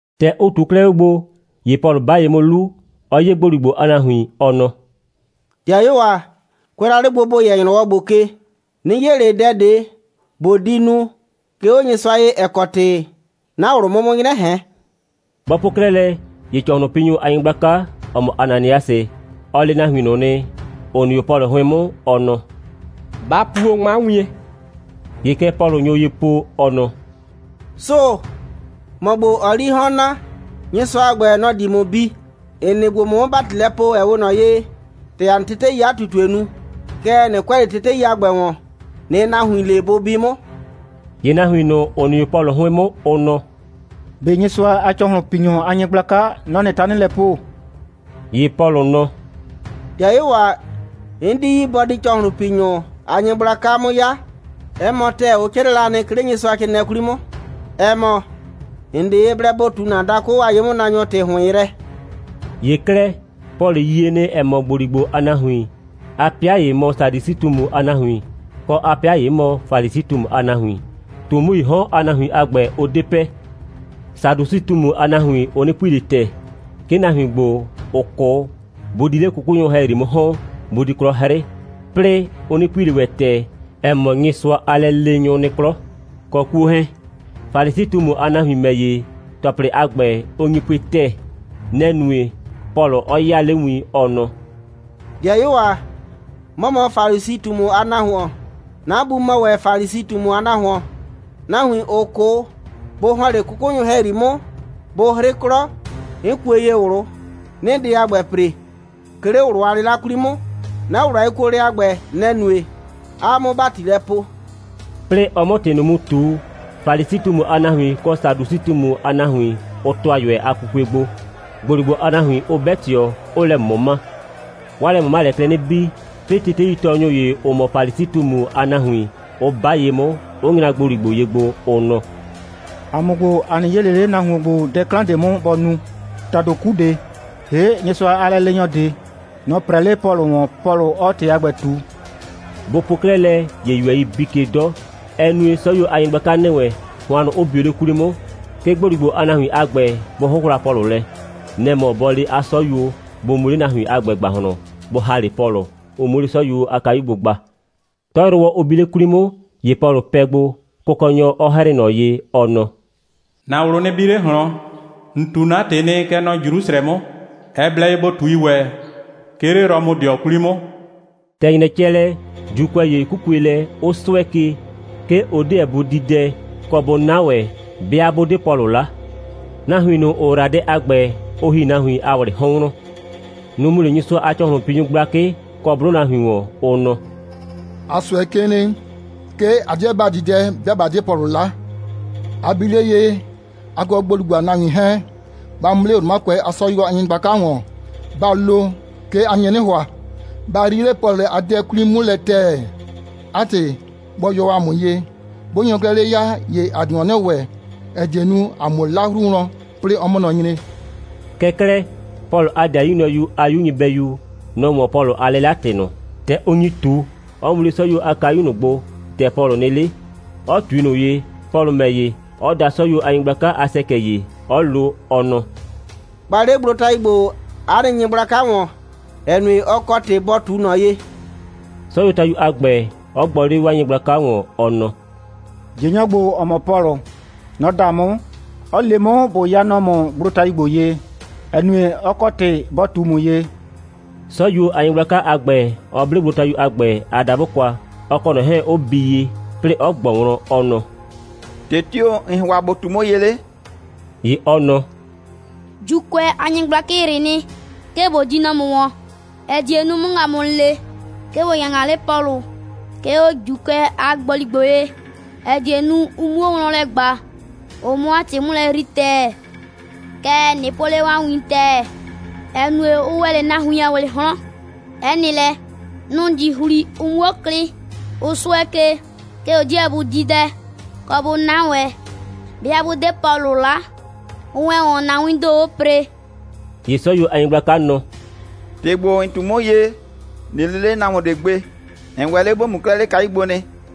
‑Tɛ ɔ ꞊tuo 'klɛɛ 'o gbo, ‑ye Pɔlʋ 'ba ye 'mʋ 'lu, 'ɔ 'ye ‑gboligbo a nahuin, ɔ nɔ: «‑Dɩayuo ‑a, kʋɛ la 'le gbo, ‑bo yɛ kɛ ‑nyrɔwɔ ‑gbo ke, 'nɩ 'ye ꞊le dɛ ꞊de, ꞊bo di nu, 'ke 'o Nyɩsʋa ye, ‑ɛ kɔ ‑tɩ 'na ꞊wlʋ 'mʋ 'mʋ 'nyrɛ ꞊hɛn.» Bɔ po 'klɛɛ lɛ, ‑ye ‑cɔhlʋnpinyʋ a nyɩgblaka, ‑ɔ mɔ Ananiasɩ, ɔ le nahuin ꞊nʋ nɩ, ‑ʋ nɩ 'o Pɔlʋ 'hʋɩn 'mʋ, ɔ nɔ: «Ba puo 'ŋma wien!» ‑Ye kɛ Pɔlʋ nyo ye po, ɔ nɔ: «Sʋʋ‑! ‑Mɔ ‑gbo, ‑ɔɔ 'lii 'hɔn naa, Nyɩsʋa a ‑gbɛ, nɔ‑ di ‑mʋ bi. ‑N nɩ gbo, ꞊mʋ 'mʋ ‑bati lɛ poo, ‑ɛ 'we ꞊nɔ ye, ‑tɛ ‑a nɩ teteii 'a ꞊tutue nu. Kɛɛ, ꞊nɩ kʋɛ ꞊le tetei a ‑gbɛ ‑wɔn, ꞊nɩɩ nahuin le, bʋ bi 'mʋ.» ‑Ye nahuin ꞊nʋ, ‑ʋ nɩ 'o Pɔlʋ 'hʋɩn 'mʋ, ʋ nɔ: «꞊Be Nyɩsʋa a ‑cɔhlʋnpinyʋ a nyɩgblaka, nɔ‑ ‑nɩɩ tanɩ lɛ poo?» ‑Ye Pɔlʋ nɔ: «‑Dɩayuo ‑a, 'n 'di yi, bɔ di ‑cɔhlʋnpinyʋ a nyɩgblaka 'mʋ 'ya. 'Ɛ mɔ ‑tɛɛ, ʋ 'crɩɛ la nɩ, 'ke 'le Nyɩsʋacrɩɩnɩɛ 'kwli 'mʋ, ‑ɛ mɔ: ‑N 'de ye blɛ ‑bo ꞊tu ‑na dakʋ a ye'mʋnaanyɔ ‑tɩ ‑hʋɩn yrɛ.» ‑Ye 'klɛɛ, Pɔlʋ yie nɩ, ‑ɛ mɔ, ‑gboligbo a nahuin, 'a 'pɩa ‑ye mɔ Sadusɩ꞊tumu a nahuin, kɔ, 'a 'pɩa ‑ye mɔ Falisi꞊tumu a nahuin. ꞊Tumuii 'hɔn a nahuin a ‑gbɛ, ʋ 'de pɛ. Sadusɩ꞊tumu a nahuin, ʋ 'nɩ pui ꞊le ‑tɛɛ, 'ke nahuin ‑gbo, ‑ʋ 'kʋ, bʋ di 'le 'kʋkʋnyʋ ‑hɛyri 'mʋ ‑hɔn, bʋ di 'klɔ 'hrɩ, 'plɩɩ ʋ 'nɩ pui ꞊le ‑wɛ ‑tɛɛ, ‑ɛ mɔ, Nyɩsʋa a lɛleenyʋ nɩ 'klɔ, kɔ 'kuo 'hɛɛn. Falisi꞊tumu a nahuin ‑mɛ ‑ye, ‑tɔplɩdʋ a ‑gbɛ, ʋ nyi pue ‑tɛɛ. Nɛ‑ nue, Pɔlʋ 'ɔ 'yaa 'le win, ɔ nɔ: «‑Dɩayuo ‑a, 'mɔ mɔ Falisi꞊tumu a nahuon. 'Na bu mɔ ‑wɛ Falisi꞊tumu a nahuon. Nahuin, ‑ʋ 'kʋ, bʋ ‑hɔn 'le 'kʋkʋnyʋ ‑hɛyri 'mʋ, bʋ 'hrɩ 'klɔ, 'n kue ye ꞊wlʋ, 'nɩɩ dɛ a ‑gbɛ ‑pre, 'ke 'le ꞊wlʋ a 'lɩla 'kwli 'mʋ. 'Na ꞊wlʋ a yekuolɛ a ‑gbɛ, nɛ‑ nue, 'aa 'mʋ ‑bati lɛ poo.» 'Plɩɩ ɔ 'mʋ ‑tɩ ꞊nʋ mu ꞊tu, Falisi꞊tumu a nahuin kɔ Sadusɩ꞊tumu a nahuin, ʋ ‑tʋa ꞊yʋɛ a pupue gbo, ‑gboligbo a nahuin 'ʋ 'bɛ ꞊tɩɔ, 'ʋʋ lɛ ꞊mʋma. 'Waa lɛ꞊mʋmalɛɛ klɛ 'nɩ bii, 'plɩɩ teteitɔɔnyʋ ‑ye, ‑ʋ mɔ Falisi꞊tumu a nahuin, 'ʋ 'ba ye 'mʋ, 'ʋ nyra ‑gboligbo ye gbo, ʋ nɔ: «‑A mʋ ‑gbo, ‑a 'nɩ 'yee ꞊le 'le nahuon ‑gbo dɛ 'klan ꞊de 'mʋ, bɔ nu. ‑Tado 'ku ꞊de, ‑hee' Nyɩsʋa a lɛleenyɔ ꞊de, nɔ‑ 'prɛɛ 'le Pɔlʋ ‑wɔn, Pɔlʋ 'ɔɔ ‑tɩ a ‑gbɛ ꞊tu.» Bʋ po 'klɛɛ lɛ, ‑ye ꞊yʋɛ bii ke 'dɔ. Ɛ nue, 'sɔyuo a nyɩgblaka ‑nɩ wɛn, hʋannʋ 'ʋ bio 'le 'kwli 'mʋ, 'ke ‑gboligbo a nahuin a ‑gbɛ bʋ 'hʋhla Pɔlʋ lɛ. Nɛ‑ mɔ bɔ le 'a 'sɔyuo, bʋ mu 'le nahuin a ‑gbɛ ‑gbahlɔn, bʋ ‑ha 'le Pɔlʋ, ʋ 'muo 'le 'sɔyuo a kayu gbo gba. 'Tɔyrʋwɔ, ʋ bi 'le 'kwli 'mʋ, ‑ye Pɔlʋ pɛ gbo, Kʋkɔnyɔ 'ɔ 'hrɩɩ ꞊nɔ ye, ɔ nɔ: «‑Na ꞊wlʋ nɩ bi 'le ꞊hlɔn. ‑N ꞊tu 'na ‑tɩ nɩ, kɛ nɔ Jrusrɛ 'mʋ. Ɛ blɛ ye ‑bo ꞊tui ‑wɛ, 'ke 'le Rɔmʋdɩɔ 'kwli 'mʋ.» ‑Tɛ ‑nyrɛ cɛ lɛ, ‑Juukʋɛ ‑ye 'kukue lɛ, 'ʋ 'sʋɛ ke, 'ke ʋ 'deɛ bʋ di dɛ, kɔ, bʋ 'na ‑wɛ, 'bɩa 'bʋ 'de Pɔlʋ 'la. Nahuin ꞊nʋ, ‑ʋ ‑yra dɛ a ‑gbɛ, ʋ ‑hi nahuin a ‑wlɩɩ 'hɔn wlɔn. Nʋ‑ mu 'le Nyɩsʋa a ‑cɔhlʋnpinyʋ gblakɩ kɔ 'blʋ nahuin ‑wɔn, ʋ nɔ: «‑A 'sʋɛ ke nɩ, 'ke ‑a 'deɛ ‑ba di dɛ, 'bɩa ꞊ba 'de Pɔlʋ 'la. A bi 'le ye, a kɔ ‑gboligbo a nahuin 'hɛɛn, ba mu 'le Romakʋɛ a 'sɔyuo a nyɩgblaka ‑wɔn, ba lo, 'ke a nye 'nɩ ‑hʋa, ba yrii 'le Pɔlʋ a dɛ 'kwli 'mʋ lɛ ‑tɛɛ. 'A ‑tɩ, bɔ yɔ 'a mʋ ye. 'Bʋ nyo 'klɛɛ 'le ya, ‑ye ‑a di ‑wɔn 'nɩ ‑wɛ, ‑ɛ die nu, ‑a 'muo 'la 'hru wlɔn, 'plɩɩ ɔ 'mʋ nɔ nyre.» Kɛɛ 'klɛɛ, Pɔlʋ a 'dɩayu nyrɔyu a 'yu nyɩbɛyu, nɔ‑ 'wɔn Pɔlʋ a 'lɩla‑tɩ ꞊nʋ, ‑tɛ ʋ nyi ꞊tu, 'ɔ mu 'le 'sɔyuo a kayu ꞊nʋ gbo, ‑tɛ Pɔlʋ nɩ 'le, 'ɔ ꞊tui ꞊nɔ ye, Pɔlʋ ‑mɛ ‑ye, 'ɔ da 'sɔyuo a nyɩgblaka a ‑sɛkɛ ‑ye, 'ɔ lo, ɔ nɔ: «Gba 'le gblotayu ‑gbo 'a nɩ nyɩgblaka ‑wɔn, ‑ɛ nue, ɔ kɔ ‑tɩ bɔ ꞊tu ꞊nɔ ye,» 'sɔyuotayu a ‑gbɛ, 'ɔ gbɔ 'le 'waa nyɩgblaka ‑wɔn, ɔ nɔ: «꞊Jɩnyɔ ‑gbo, ‑ɔ mɔ Pɔlʋ, nɔ‑ da 'mʋ, 'ɔ le 'mʋ, ꞊bo ya nɔ ‑mʋ gblotayu ‑gbo ye, ‑ɛ nue, ɔ kɔ ‑tɩ bɔ ꞊tu ‑mʋ ye,» 'sɔyuo a nyɩgblaka a ‑gbɛ 'ɔ ble gblotayu a ‑gbɛ a dabʋ kwa, ɔ kɔ ꞊nɔ 'hɛɛn 'ʋ bii ye, 'plɩɩ 'ɔ ꞊gbɔ wlɔn, ɔ nɔ: «‑Tɩ tio‑ ‑n ‑hʋa ‑bo ꞊tu 'mʋ ye 'le?» ‑Ye ɔ nɔ: «‑Juukʋɛ a nyɩgblakɩ ‑yrɩ nɩ, 'ke ꞊bo di nɔ ‑mʋ ‑wɔn, ‑ɛ die nu, ʋ 'mʋ ‑ŋa ‑mʋ le, 'ke ‑bo ya ‑ŋa 'le Pɔlʋ, 'ke 'o ‑Juukʋɛ a ‑gboligbo ye, ‑ɛ die nu, ʋ 'muo wlɔn lɛ ꞊gba, ʋ 'mʋ 'a ‑tɩ 'mʋ lɛ yrii ‑tɛɛ. Kɛɛ, ꞊nɩ po 'le 'waa win ‑tɛɛ, ‑ɛ nue, ʋ ‑wɛ 'le nahuin a ‑wlɩɩ 'hɔn, 'ɛ nɩ lɛ, nʋ‑ di ‑hli, ʋ 'muo klɩ. Ʋ 'sʋɛ ke, 'ke ʋ 'deɛ bʋ di dɛ, kɔ, bʋ 'na ‑wɛ, 'bɩa 'bʋ 'de Pɔlʋ 'la. Ʋ ‑wɛ ‑wɔn, ‑na wiin ‑do, ʋʋ ‑pre.» ‑Ye 'sɔyuo a nyɩgblaka nɔ: «‑Tɩ ‑gbo, ‑n ꞊tu 'mʋ ye, ꞊nɩ le 'le nahuon ꞊de gbe. ‑N ‑wɛ 'le ‑bo mu 'klɛɛ 'le kayu gbo nɩ.»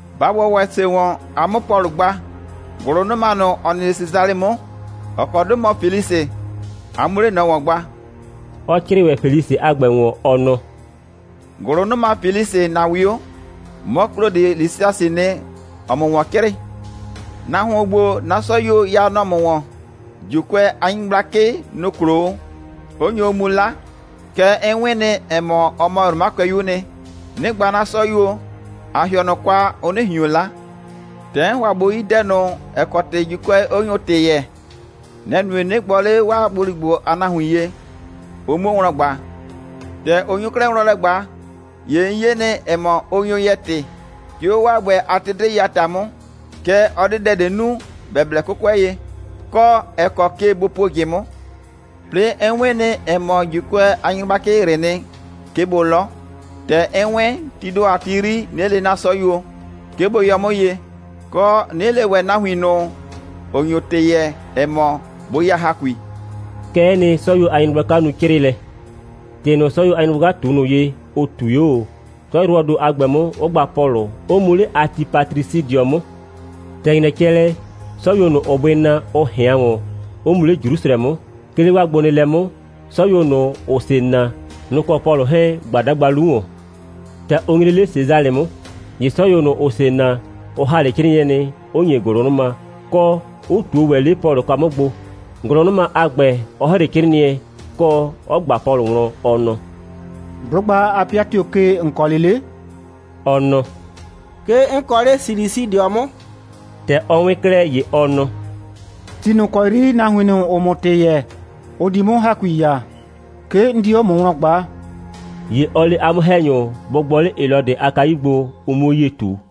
Ba ‑wɔ ‑wɛ ‑se ‑wɔn, a 'mʋ Pɔlʋ gba, ‑gʋlʋnʋma ꞊nʋ, ‑ɔ nɩ 'le Sesalɩ 'mʋ, ‑ɔ kɔ 'dʋ mɔ Felisɩ, a 'muo 'le ꞊nɔ ‑wɔn gba,» 'ɔ 'crɩɩ ‑wɛ Felisɩ a ‑gbɛ ‑wɔn, ɔ nɔ: «‑Gʋlʋnʋma Felisɩ, ‑na 'wio. 'Mɔ, Klodɩ Lisiasɩɩ nɩ, ‑ɔɔ ‑mʋ ‑wɔn 'crɩɩ. Nahuon ‑gbo, 'na 'sɔyuo ya nɔ ‑mʋ ‑wɔn, ‑Juukʋɛ a nyɩgblakɩ, nʋ‑ klo o, 'ʋ nyo o mu 'la. Kɛɛ, 'n 'wɩn nɩ, ‑ɛ mɔ, ɔ mɔ Romakʋɛyuu nɩ, 'nɩ gba 'na 'sɔyuo, ꞊a ‑hɩɔ ꞊nɔ kwa, ʋ 'nɩ ꞊hion 'la. ‑Tɛ 'n ‑hʋa ꞊bo yi dɛ ꞊nʋ, ‑ɛ kɔ ‑tɩ ‑Juukʋɛ 'ʋ nyo ‑tɩ yɛɛ, nɛ‑ nue, 'nɩ gbɔ 'le 'waa ‑gboligbo a nahuin ye, ʋ 'muo wlɔn ꞊gba. ‑Tɛ ʋ nyo 'klɛɛ wlɔn lɛ ꞊gba, ‑ye 'n 'ye nɩ, ‑ɛ mɔ, ʋ nyo yɛɛ ‑tɩ, 'ke 'o 'waa ‑gbɛ a tetei a ‑ta 'mʋ. Kɛɛ, ɔ 'de dɛ ꞊de nu, ‑bɛ blɛ 'kʋkʋɛ ye, kɔ, ‑ɛ kɔ ke bʋ puo ꞊jɩ 'mʋ. 'Plɩɩ, 'n 'wɩn nɩ, ‑ɛ mɔ, ‑Juukʋɛ a nyɩgblakɩ ‑yrɩ nɩ, 'ke bʋ 'lɔ. ‑Tɛ 'n 'wɩn, tii ‑do a ti 'yri, 'nɩ le 'na 'sɔyuo, 'ke bʋ yɔ ‑mʋ ye, kɔ, 'nɩ le ‑wɛ nahuin ꞊nʋ, ‑ʋ nyo ‑tɩ yɛɛ, ‑ɛ mɔ, bʋ ya ‑hakui.» Kɛ'ɛ nɩ, 'sɔyuo a nyɩgblaka nu 'crɩɩlɛ. ‑Tɩ ꞊nʋ, 'sɔyuo a nyɩgbaka ꞊tu ꞊nʋ ye, ʋ ꞊tui 'o ꞊o, 'tɔyrʋwɔɔ ‑do a ‑gbɛ 'mʋ, 'ʋ gba Pɔlʋ, 'ʋ mu 'le Atipatrisɩdɩɔ 'mʋ. ‑Tɛ ‑nyrɛ cɛ lɛ, 'sɔyuo ꞊nʋ, ‑ʋʋ bʋɩ naa, ʋ ꞊hɩan ‑wɔn, 'ʋ mu 'le Jrusrɛ 'mʋ, 'ke 'le 'waa gbonɩɩlɛ 'mʋ, 'sɔyuo ꞊nʋ, ‑ʋʋ ‑se naa, nʋ‑ kɔ Pɔlʋ 'hɛɛn‑ gba 'dagba 'lu ‑wɔn. ‑Tɛ ʋ nyre 'le Sesalɩ 'mʋ, ‑ye 'sɔyuo ꞊nʋ, ‑ʋʋ ‑se naa, ʋ ‑ha 'le 'crɩɩnɩɛ nɩ, 'ʋ ‑nye ‑gʋlʋnʋma, kɔ, 'ʋ ꞊tuo ‑wɛ 'le Pɔlʋ kwa 'mʋ gbo, ‑gʋlʋnʋma a ‑gbɛ 'ɔ ‑hre 'crɩɩnɩɛ, kɔ, 'ɔ ꞊gba Pɔlʋ wlɔn, ɔ nɔ: «'Blʋgba a 'pɩa tio‑ kɔ ke, ‑n kɔ 'le 'le?» Ɔ nɔ: «'Ke 'n kɔ 'le Silisidɩɔ 'mʋ.» ‑Tɛ ɔ 'wɩn 'klɛɛ, ‑ye ɔ nɔ: «Ti ꞊nʋ ‑kɔ 'yri nahuin ꞊nʋ, ‑ʋʋ ‑mʋ ‑tɩ yɛɛ, ʋ di 'mʋ ‑hakui ya, 'ke 'n di 'o ‑mʋ wlɔn ꞊gbaa.» ‑Ye ɔ le 'a 'mʋ‑hɛnyʋ, bʋ gbɔ 'le Helɔdɩ a kayu gbo, ʋ 'muo 'yie ꞊tu.